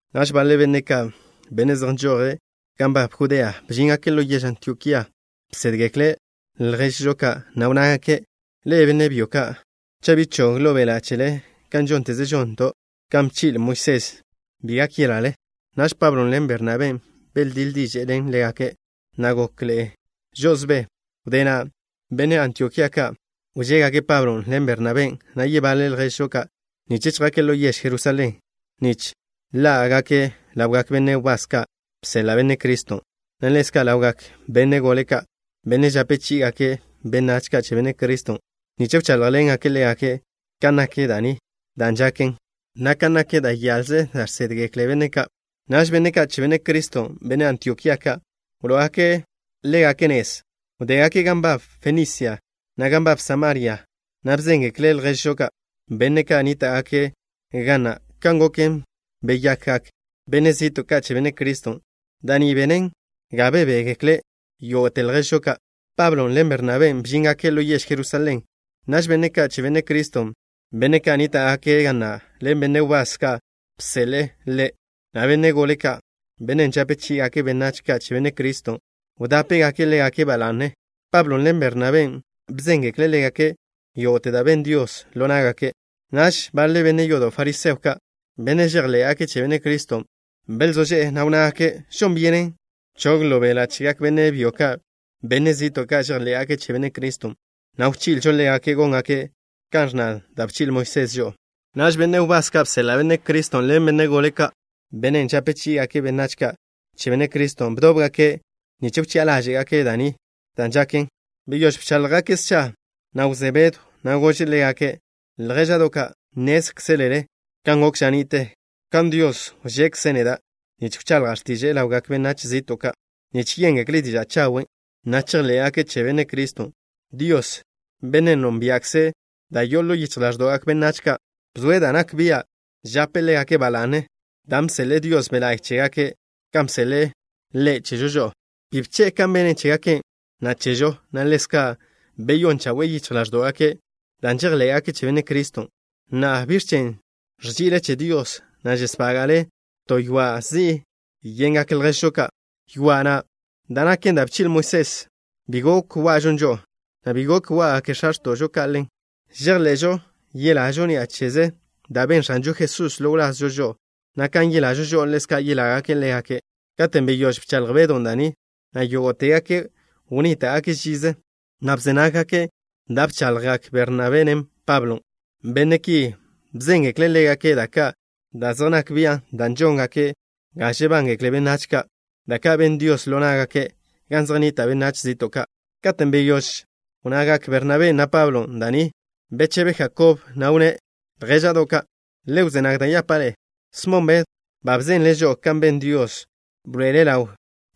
Naž baḻe benne' ka', benne' zej nžoje' gan nbab Judea, bžíngake' ḻo yež Antiokía. Bsédgekle' lježžo ka', na' wnnágake': —Ḻe'e, benne' byo ka', cha' bi chog ḻo beḻa' chele kan žónteze žonto', kan bchi'le Moisés, bi gak yelale. Naž Pablo ḻen Bernabé beldíḻ diže'e ḻen ḻégake', na' gokḻe'e žo'osbé. Wdé na', benne' Antiokía ka' wžégake' Pablon' ḻen Bernabén', na' yebaḻe lježžo ka', nich chjake' ḻo yež Jerusalén, nich ḻá'gake' ḻawgak benne' wbás ka' bseḻa' Benne' Criston', na' ḻezka' ḻawgak benne' gole ka', benne' žape chí'igake' benách ka' che Benne' Criston', nich wcháḻjḻengake' ḻégake' kan nak da' ni da' žaken, na' kan nak da' yaḻze da' žsédgekle benne' ka'. Naž benne' ka' che Benne' Criston', benne' Antiokía ka', wló'ogake' ḻégake' nez. Wdégake' gan nbab Fenisia, na' gan nbab Samaria, na' bzéngekle' lježžo ka', benne' nníta'gake' ga na', kan goken, beyakgak benne' zi'to' ka' che Benne' Criston'. Da' ni benen ga bebégekle yógo'te lježžo ka'. Pablon' ḻen Bernabén' bžíngake' ḻo yež Jerusalén. Naž benne' ka' che Benne' Criston', benne' ka' nníta'gake' ga na' ḻen benne' wbás ka' bseḻe'e Ḻe', na' benne' gole ka', benne' žape chí'igake' benách ka' che Benne' Criston', wdápegake' ḻégake' ba la'ne. Pablon' ḻen Bernabén' bzéngekle' ḻégake' yógo'te da' ben Dios ḻo ná'gake'. Naž baḻe benne' yodo' fariseo ka', benne' žejḻé'gake' che Benne' Criston', belzó ži'e, na' wnnágake': —Žon byenen chog ḻo beḻa' chegak benne' byo ka', benne' zi'to' ka' žejḻé'gake' che Benne' Criston', na' wchi'ilžo ḻégake' góngake' kan ẕnna da' bchi'le Moisés žo'o. Naž benne' wbás ka' bseḻa' Benne' Criston' ḻen benne' gole ka', benne' žape chí'igake' benách ka' che Benne' Criston', bdóbgake' nich wchi'a ḻáže'gake' da' ni da' žaken. Wdé bcháḻjgake' scha, na' wzé Bedw, na' gože' ḻégake': —Ljéža'do' ka'. Nnézkzelele kan gok ža ni'te, kan Dios wžekze' neda' nich wchaḻja' x̱tiže'e ḻawgak benách zi'to' ka' nich yéngekle' diža' chawen', na' chejḻé'gake' che Benne' Criston'. Dios, Bennen' nónbia'kze' da' yo'o ḻo yichj ḻáẕdo'gak benách ka', bzoe' da' nak bia' žape' ḻégake' ba la'ne, dan' bseḻe'e Dios Be' La'y chégake', kan bseḻe'e Ḻe' chežo žo'o. Bi bche'e kan bene' chégake', na' chežo, na' ḻezka' beyón chawe'e yichj ḻáẕdo'gake' dan' žejḻé'gake' che Benne' Criston'. Na'a, ¿biẕ chen' ẕži'ile che Dios, na' žesbága'le to ywa' zi'i yengak lježžo ka'? Ywa' na', da' naken da' bchi'le Moisés, bi gok wa'žon žo'o, na' bi gok wá'gaken x̱a x̱to'žo ka'. Žejḻe'žo yelažo ni'a cheze da' ben X̱anžo Jesús ḻo wláz žo'o, na' kan yelažo žo'o, ḻezka' yelágake' ḻégake'. Katen' beyóž bchaḻj Bedon' da' ni, na' yógo'tegake' wnníta'gake' žize, na' bze nággake' da' bchaḻjgak Bernabén', na' Pablon'. Benne' ki bzéngekle' ḻégake' da' ka' da' zej nak bian' da' žóngaken ga žebángekle benách ka', da' ka' ben Dios ḻo ná'gake' gan zej nnita' benách zi'to' ka'. Katen' beyóž wnnagak Bernabén', na' Pablon' da' ni, bechebe Jakob, na' wnné': —Ljéža'do' ka'. Le wzé nag da' yapa' ḻe'e. Smon Bedw ba bzenle' žo'o kan ben Dios, bḻoe'ele' ḻaw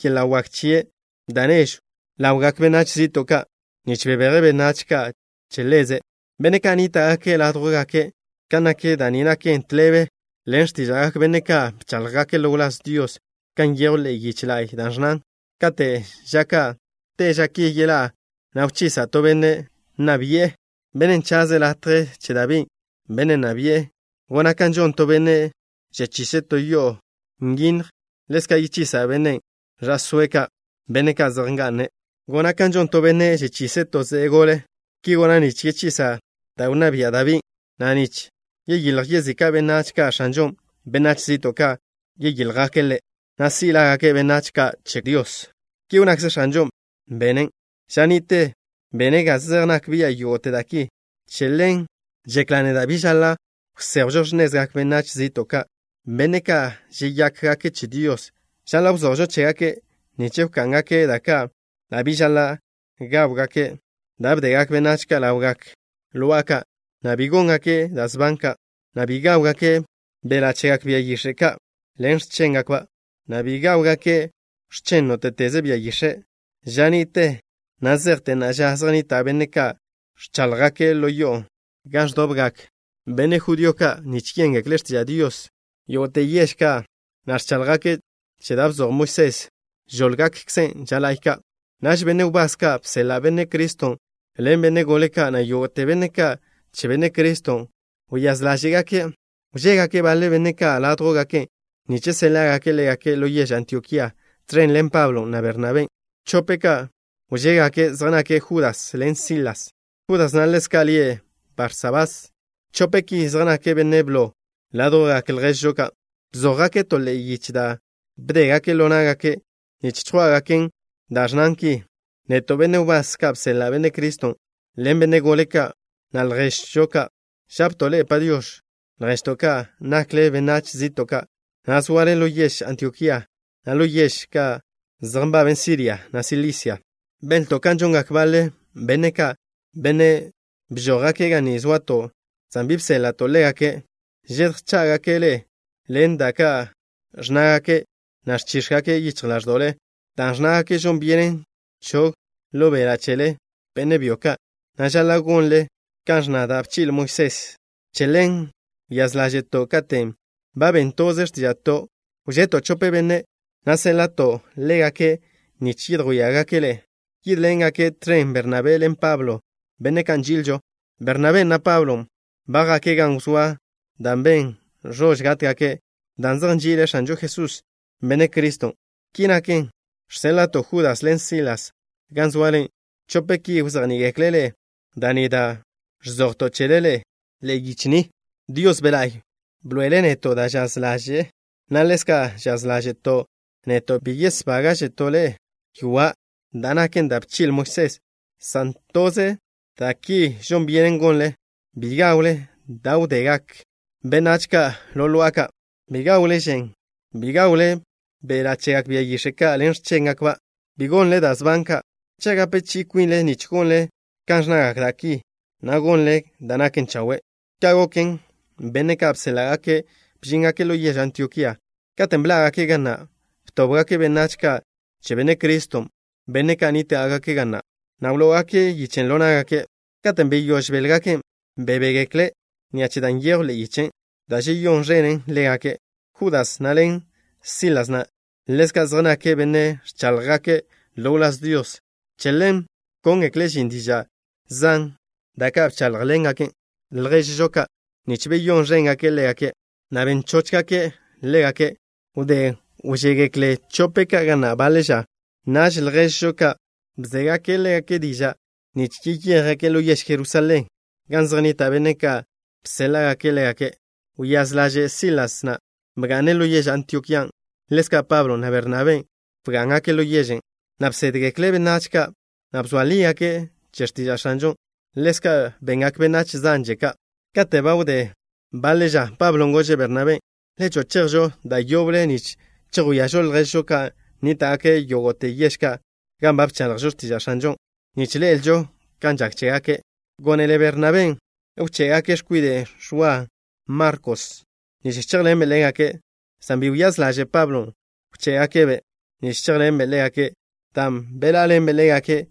yeḻa' wak chie' da' nežw chi'i ḻawgak benách zi'to' ka' nich bebeje' benách ka' che Ḻeze', benne' ka' nníta'gake' ládjwgake'. Kan nak da' ni naken tḻebe ḻen x̱tíža'gak benne' ka' bcháḻjgake' ḻo wláz Dios, kan nyejw ḻe'e yiche la'y, da' ẕnnan: Kate' ža ka' te ža ki yeḻá'a, na' wchisa' to Benne' nna bi'e, Bennen' chaze' latje che Dabí, bennen' wnná bi'e. Gona' kan žon to benne' žechise' to yo'o nyinnj. Ḻezka' yechisa' benne' ẕa'sóe' ka', benne' ka' zej nga'ne'. Gona' kan žon to benne' žechise' to ze'e gole. Ki gona' nich yechisa' da' wnná bia' Dabín', na' nich chiljgak yezika' benách ka' X̱anžon'. Benách zi'to' ka' chíljgake' Ḻe', na' si' lágake': Benách Ka' Che Dios. Ki wnnakze X̱anžo, Bennen' ža ni'te bene' ga zej nak bia' yógo'te da' ki. ’Che ḻen žekla' neda' bi žaḻa' wséjwžo x̱nezgak benách zi'to' ka', benne' ka' žeyákgake' che Dios. Žaḻa' wzojžo chégake' nich wká'ngake' da' ka' da' bi žaḻa' gáwgake', da' bdegak benách ka' ḻawgak lo'a ka', na' bi góngake' da' sban ka', na' bi gáwgake' beḻa' chegak bia yix̱e' ka' ḻen x̱chéngakba', na' bi gáwgake' x̱chen nóte'teze bia yix̱e'. Ža ni'te, na' zejte na'a ža zej nnita' benne' ka' ẕcháḻjgake' ḻo yo'o gan ẕdobgak benne' judío ka' nich yéngekle' x̱tiža' Dios yógo'te yež ka', na' ẕcháḻjgake' che da' bzoj Moisés. Žóḻgakkzen' ža la'y ka'. Naž benne' wbás ka' bseḻa' Benne' Criston' ḻen benne' gole ka', na' yógo'te benne' ka' che Benne' Criston', wyáz ḻáže'gake' wžégake' baḻe benne' ka' ládjwgake' nich séḻa'gake' ḻégake' ḻo yež Antiokía, tẕen ḻen Pablon', na' Bernabén'. Chope' ka' wžégake' zej nake' Judas ḻen Silas. Judas na' ḻezka' lie' Barsabás. Chope' ki zej nake' benne' blo ládjwgak lježžo ka'. Bzójgake' to ḻe'e yiche da' bdégake' ḻo ná'gake', nich chjwá'gaken', dan' ẕnnan ki: “Neto', benne' wbás ka' bseḻa' Benne' Criston' ḻen benne' gole ka', na' lježžo ka', žapto' ḻe'e: “Padiox̱” lježto' ka', nakle benách zi'to' ka', na' zoale ḻo yež Antiokía, na' ḻo yež ka' zej nbaben Siria, na' Silicia. Benlto' kan žongak baḻe benne' ka', benne' bžójgake' ga ni zoato', san bi bséḻa'to' ḻégake'. Žedjchá'gake' ḻe'e ḻen da' ka' ẕnnágake', na' ẕchíx̱gake' yichj ḻáẕdo'le, dan' ẕnnágake' žon byenen chog ḻo beḻa' chele, benne' byo ka', na' žaḻa' gonle kan ẕnna da' bchi'le Moisés. Che ḻen wyáz ḻáže'to' katen' ba ben toze x̱tíža'to', wžeto' chope benne', na' séḻa'to' ḻégake' nich yedjwíagake' ḻe'e. Yídḻengake' tẕen Bernabé ḻen Pablo, benne' ka' nži'ilžo. Bernabén', na' Pablon' ba jake' gan wzóa da' ben ẕož gátgake' dan' zej nži'ile' X̱anžo Jesús, Benne' Criston'. Ki naken, žséḻa'to' Judas ḻen Silas gan zoale. Chope' ki wzejní'igekle' ḻe'e da' ni da' ẕzojto' chele ḻe'e yiche ni. Dios Be' La'y bḻoe'ele' neto' da' žaz ḻaže'e, na' ḻezka' žaz ḻáže'to' neto', bi yesbága'žeto' ḻe'e ywa', da' naken da' bchi'le Moisés, san toze da' ki da' žon byenen gonlen. Bi gawle da' wdé ḻawgak lo'a ka'. Bi gawle žen. Bi gawle beḻa' chegak bia yix̱e' ka' ḻen x̱chéngakba'. Bi gonle da' sban ka'. Cha' gape chi'i kwinle, nich gonle kan ẕnnagak da' ki, na' gonle da' naken chawe'.” Ka' goken, benne' ka' bséḻa'gake' bžíngake' ḻo yež Antiokía. Katen' bḻá'gake' ga na', btóbgake' benách ka' che Benne' Criston', benne' ka' nníta'gake' ga na', na' wló'ogake' yichen' ḻo ná'gake'. Katen' beyóž béḻgaken', bebégekle' ni'a che da' nyejw ḻe'e yichen', da' žeyón ẕenen ḻégake'. Judas na' ḻen Sílasen' ḻezka' zej nake' benne' ẕcháḻjgake' ḻo wláz Dios. Che len bkóngekle' žin diža' zan, da' ka' bcháḻjḻengake' lježžo ka', nich beyón ẕéngake' ḻégake', na' ben chóchgake' ḻégake'. Wdé bžégekle' chope' ka' ga na' baḻe ža, naž lježžo ka' bzégake' ḻégake' diža' nich yeyéjgake' ḻo yež Jerusalén gan zej nnita' benne' ka' bséḻa'gake' ḻégake'. Wyáz ḻaže' Sílasen' bga'ne' ḻo yež Antiokían'. Ḻezka' Pablon', na' Bernabén' bgá'ngake' ḻo yežen', na' bsédgekle' benách ka', na' bzoa lígake' che x̱tiža' X̱anžon'. Ḻezka' bengak benách zanže ka'. Kate' ba wdé baḻe ža Pablo gože' Bernabé: —Le cho'o chejžo da' yoble nich chejwíažo lježžo ka' nníta'gake' yógo'te yež ka' gan ba bchaḻjžo x̱tiža' X̱anžon', nich ḻe'elžo kan žak chégake'. Gónele Bernabén' wché'gake' x̱kwide' Ẕwa Markos, nich chéjḻenbe' ḻégake', san bi wyáz ḻaže' Pablon' wché'gake'-be' nich chéjḻenbe' ḻégake' dan' bḻá'aḻenbe' ḻégake'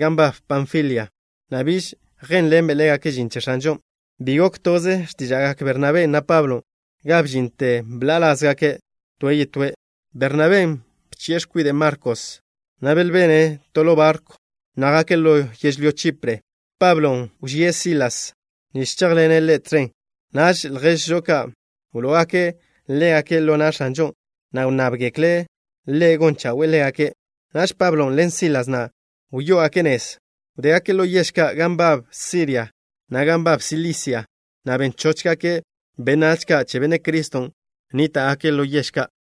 gan nbab Panfilia, na' biž yjénḻenbe' ḻégake' žin che X̱anžon'. Bi gok toze x̱tíža'gak Bernabén', na' Pablon', ga bžinte bḻa'a ḻázgake' toe' yetóe'. Bernabén' bchi'e x̱kwide' Markos, na' belbene' to ḻo barkw, na' jake' ḻo yežlyó Chipre. Pablon' wžíe' Silas nich chéjḻene' ḻe' tẕen. Naž lježžo ka' wló'ogake' ḻégake' ḻo na' X̱anžon', na' wnnábgekle' Ḻe' gon chawe'e ḻégake'. Naž Pablon' ḻen Sílasen' wyó'ogake' nez. Wdégake' ḻo yež ka' gan nbab Siria, na' gan nbab Silisia, na' ben chóchgake' benách ka' che Benne' Criston' nníta'gake' ḻo yež ka'.